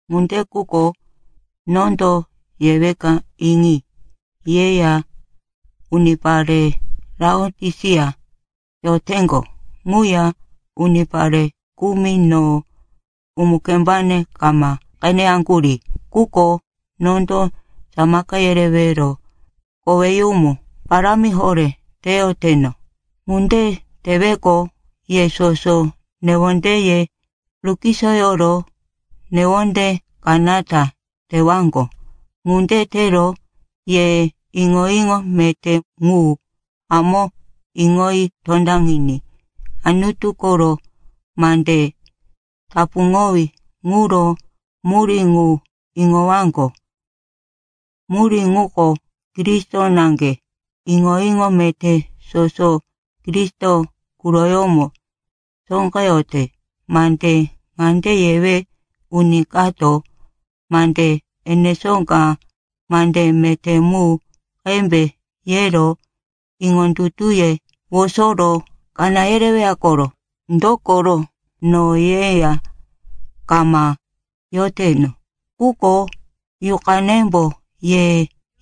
Ŋunde quko nondo yeweka iŋi. Yeya unipare Laotisia yoteŋgo quya unipare kumi no umu-kembane kama qeneyaŋgurí. Quko nondo samaka yerewero koweyumu parámi horé teyoteno. Ŋunde teweqo, ye soso newondeye rukisoyoro newonde kanata tewaŋgo. Ŋunde tero ye iŋo-iŋo meté ŋu hamó iŋoyi tondaŋiní Anutu koro mande tapuŋowí ŋuro murí ŋu iŋowaŋgo. Murí ŋuko Kristo naŋge. Iŋo-iŋo meté soso Kristo quroyómo sóqeyote. Mande ŋande yewe, uni kato mande enesó ka, mande meté mu qembe, yero iŋondutuye wosoro kaná yereweya koro. Dokoro no yeya kama yoteno, quko yuqanembo ye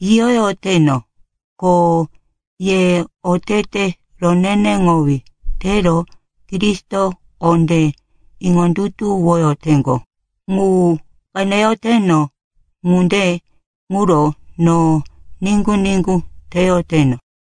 yiyoyoteno. Ko ye otete roneneŋowí tero Kristo kondé iŋondutuwoyoteŋgo, ŋu qeneyoteno. Ŋunde ŋuro no niŋgu-niŋgu teyoteno.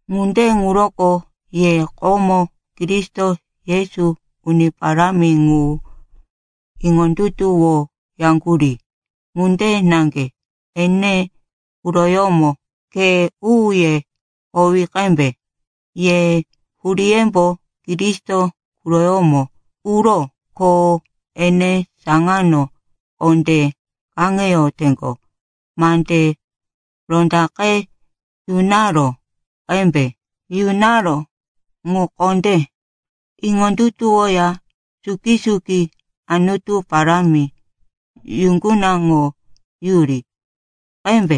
Ŋunde ŋuroko ye komo Kristo Yesu, Uni Parámi ŋu iŋondutuwoyaŋgurí ŋunde naŋge ene quroyómo khe u-uye howi qembe. Ye huríyembo Kristo quroyómo uró, ko ene saŋano kondé kaŋeyoteŋgo. Mande rondaqe yunaró ŋu kondé iŋondutuwoya suki-suki Anutu parámi yuŋgunaŋoyuri qembe.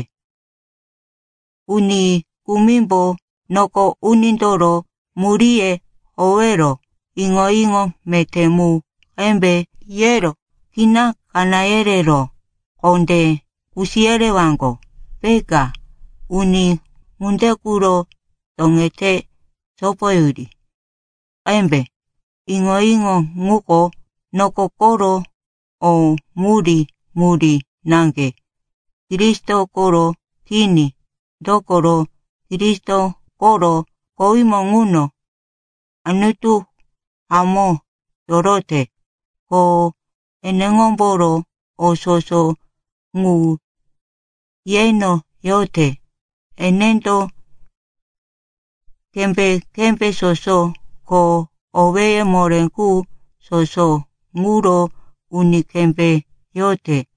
Uni kumimbo noko unindoro muríye howero iŋo-iŋo meté mu qembe, yero kina kaná yerero kondé kusi yerewaŋgo, peka. Uni ŋunde quro toŋete sopoyuri qembe. Iŋo-iŋo ŋuko noko koro o murí-murí naŋge, Kristo koro kini. Dokoro Kristo koro kowímo ŋuno Anutu hamó yorote. Ko eneŋomboro o soso ŋu yeno yote. Enendo kembé-kembé soso ko owéye moré qu soso ŋuro uni kembé yote.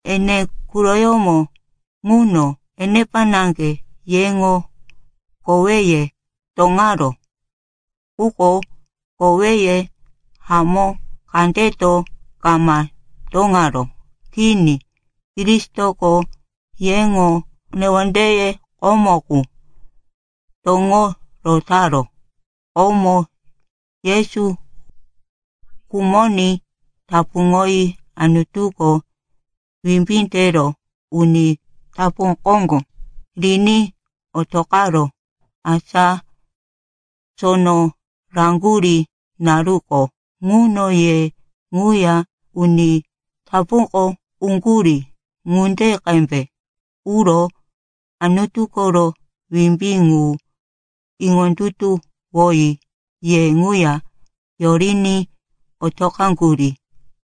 Ene quroyómo ŋuno enepa naŋge yeŋo koweye toŋaró. Quko koweye hamó kandeto kama toŋaró. Kini, Kristoko yeŋo newondeye komo qu toŋo rotaró. Komo Yesu khumoní tapuŋoyi Anutuko wimbí tero uni tapu koŋgo riní otoqaró. Asa sono raŋgurí naruko ŋuno, ye ŋuya uni tapuko uŋgurí ŋunde qembe. Uro Anutu koro wimbí ŋu iŋondutuwoyi ye ŋuya yoriní otoqaŋgurí.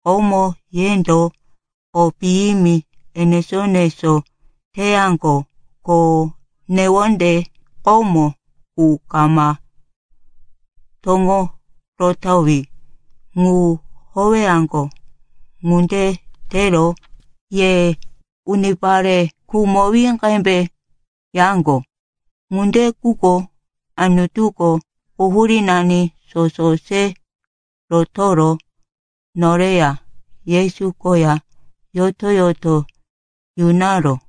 Komo yendo o piyimi enesó-enesó teyaŋgo, ko newonde komo qu kama toŋo rotowí mu howeyaŋgo. Ŋunde tero ye unipare khumowí qembe yaŋgo. Ŋunde quko Anutuko quhurínani soso se rotoro noreya Yesu koya yoto-yoto yunaró.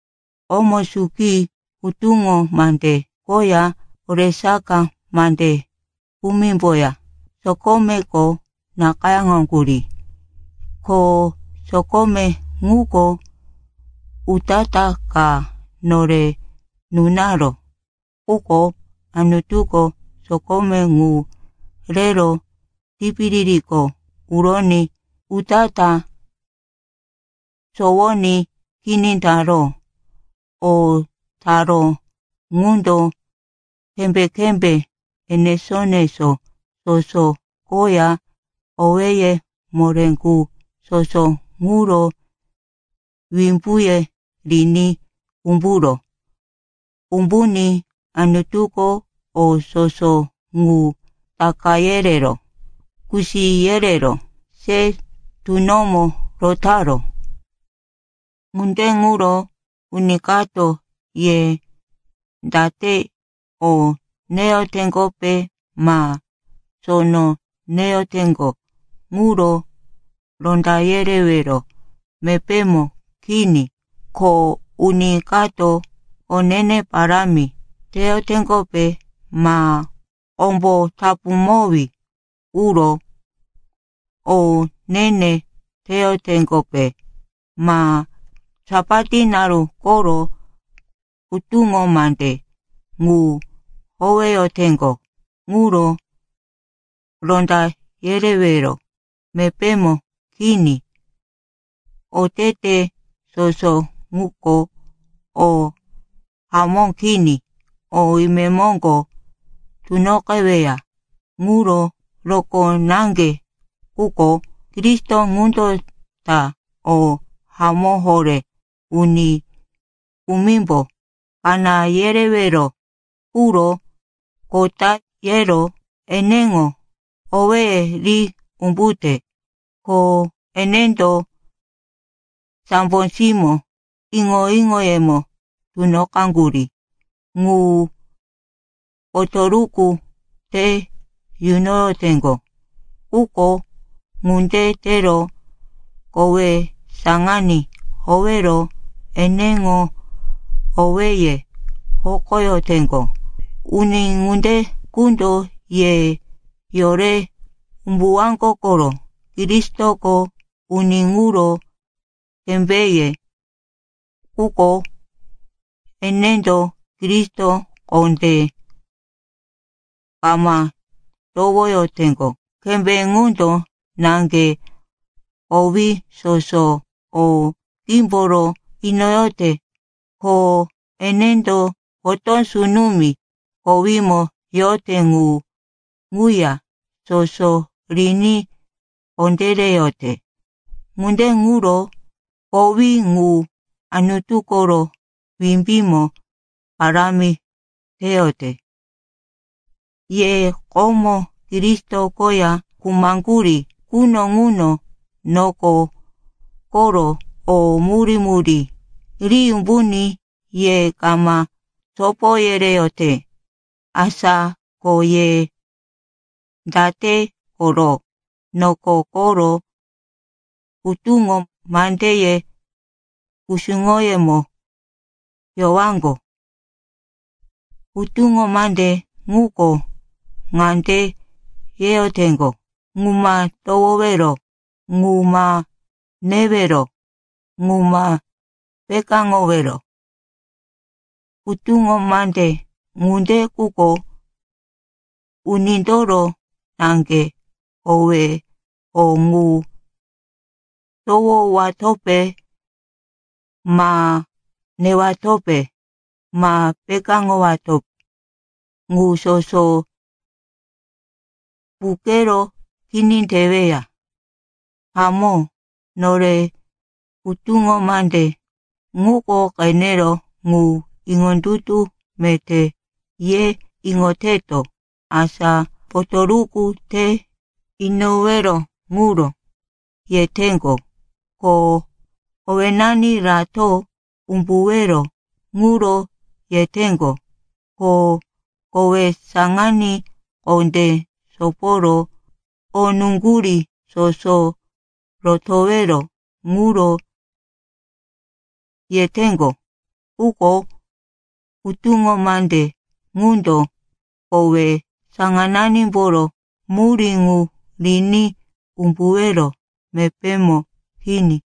Komo suki hutuŋo mande koya oresaka mande kumimboya sokomeko nakayáŋgurí, ko sokome ŋuko utatá ka nore nunaró. Quko Anutuko sokome ŋu rero tipiririko uroní utatá sowoní kini taró. O taró ŋundo kembé-kembé enesó-enesó soso koya owéye moré qu soso ŋuro wimbuye riní umburó. Umbuní Anutuko o soso ŋu taka yerero kusi yerero se tunomo rotaró. Ŋunde ŋuro uni kato ye date o neyoteŋgope ma sono neyoteŋgo ŋuro ronda yerewero mepémo kini. Ko uni kato o ne-ne parámi teyoteŋgope ma kombo tapuŋowí quro o ne-ne teyoteŋgope ma Sapat naru koro hutuŋo mande ŋu howeyoteŋgo ŋuro ronda yerewero mepémo kini. Otete soso ŋuko o hamó kini, o imemoŋgo tunoqeweya ŋuro rokó naŋge. Quko Kristo ŋundo ta o hamó horé. Uni kumimbo kaná yerewero quro kota yero eneŋo owéye ri umbute. Ko enendo sambo simó iŋo-iŋoyemo tunoqaŋgurí ŋu potoruku te yunoyoteŋgo. Quko ŋunde tero kowe saŋaní howero eneŋo owéye hokoyoteŋgo. Uni ŋunde qundo ye yore umbuwaŋgo koro. Kristoko uni ŋuro kembéye, quko enendo Kristo kondé kama towoyoteŋgo. Kembé ŋundo naŋge kowí soso o qímboro inoyote, ko enendo potó sunumi kowímo yote ŋu ŋuya soso riní kondéreyote. Ŋunde ŋuro kowí ŋu Anutu koro wimbímo parámi teyote. Ye komo Kristo koya khumaŋgurí quno ŋuno noko koro o murí-murí ri umbuní ye kama sopo yereyote. Asa ko ye date koro noko koro hutuŋo mandeye kusuŋoyómo yowaŋgo? Hutuŋo mande ŋuko ŋande yeyoteŋgo, “Ŋu ma towowero, ŋu ma newero, ŋu ma pekáŋowero.” Hutuŋo mande ŋunde quko unindoro naŋge. Kowe o ŋu towowatope ma newatope ma pekáŋowato ŋu soso puqero kini teweya. Hamó, nore hutuŋo mande ŋuko qenero, ŋu iŋondutu meté, ye iŋoteto. Asa potoruku te inowero ŋuro yeteŋgo, ko owénani rato umbuwero ŋuro yeteŋgo, ko kowe saŋaní kondé soporo o nuŋgurí soso rotowero ŋuro yeteŋgo. Quko hutuŋo mande ŋundo kowe saŋananimboro murí ŋu riní umbuwero mepémo kini.